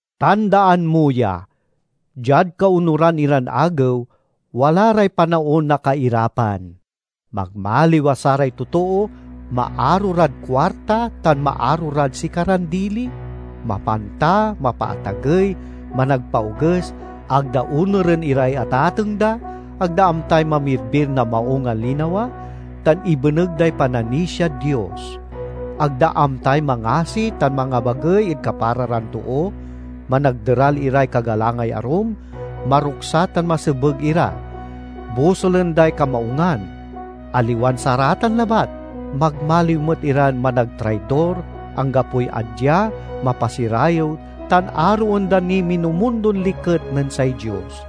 Tandaan mo ya! Diad kaonuran iran agew wala ray panaon na kairapan. Magmaliw a saray totoo maaro rad kuarta tan maaro rad sikaran dili, mapanta, mapaatagey, managpaoges, ag da onuren iray atateng da, ag da amtay mamirbir na maung a linawa, tan ibeneg day pananisiad Dios; ag da amtay mangasi tan mangabagey ed kapara ran too, managderal iray kagalangay arum, maruksa tan masebeg ira; bosulen day kamaungan; aliwan saratan labat, magmaliw met iran managtraidor, anggapoy adya, mapasirayew, tan aroen da niy minumundon liket nen say Dios.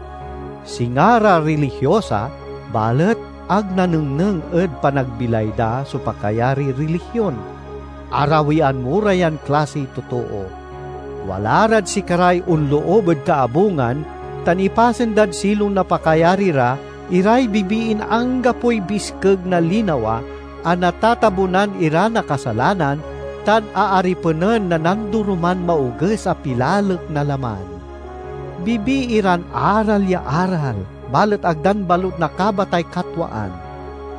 Singa ra rilihiosa, balet ag nanengneng ed panagbilay da so pakayariy rilihion. Arawian mo ra yan klasiy totoo. Wala rad sikaray onloob ed kaabungan tan ipasen dad silong na pakayari ra iray bibiin anggapoy biskeg na linawa, a natatabunan ira na kasalanan tan aaripenen na nandoroman maoges a pilalek na laman. Bibii ran aral ya aral, balet ag dan balut nakabatay katwaan.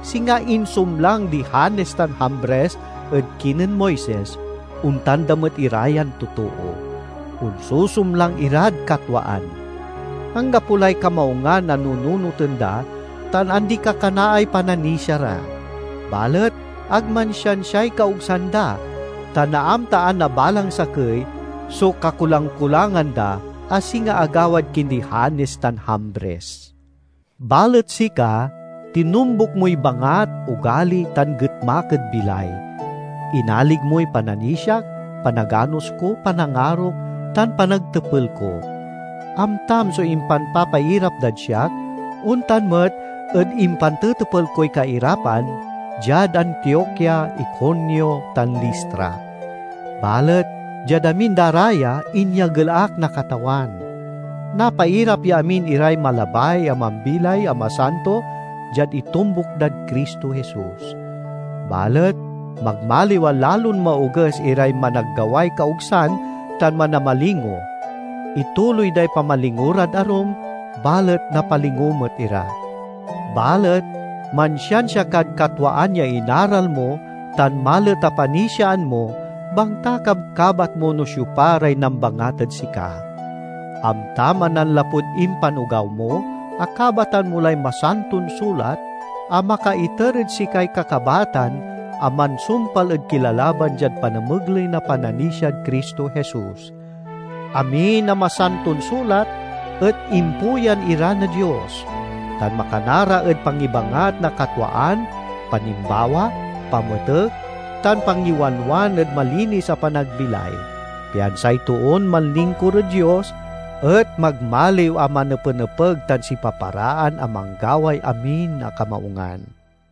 Singa insumlang di Janes tan Jambres ed kinen Moises, ontan da met ira yan totoo; onsusumlang irad katwaan. Anggapo lay kamaungan a nunoten da tan andi-kakanaay pananisia ra. Balet ag mansiansiay kaogsan da, ta naamtaan na balang sakey so kakulang-kulangan da, a singa agawad kindi Janes tan Jambres. Balet sika, tinombuk moy bangat, ogali, tan getmak ed bilay. Inalig moy pananisiak, panaganos ko, panangarok, tan panagtepel ko. Amtam so impanpapairap dad siak, ontan met ed impantetepel koy kairapan diad Antiokia, Iconio, tan Listra. Balet diad amin da ra ya, inyagel ak na Katawan. Napairap ya amin iray malabay a mambilay a masanto diad itombuk dad Cristo Jesus. Balet magmaliw a lalon maoges iray managgaway kaogsan tan manamalingo. Ituloy day pamalingo rad arum, balet napalingo met ira. Balet mansiansia kad katwaan ya inaral mo tan malet a panisiaan mo bangta kabkabat mo no siopa ray nambangat ed sika. Amtam a nanlapud impanogaw mo, akabatan mo lay Masanton Sulat a makaiter ed sikay kakabatan a mansumpal ed kilalalaban diad panamegley na pananisiad Cristo Jesus. Amin a Masanton Sulat et impuyan ira na Dios, tan makana ra ed pangibangat na katwaan, panimbawa, pametek, tan pangiwanwan ed malinis a panagbilay, pian say toon manlingkur ed Dios et magmaliw a manepenepeg tan sipaparaan a manggaway amin a kamaungan.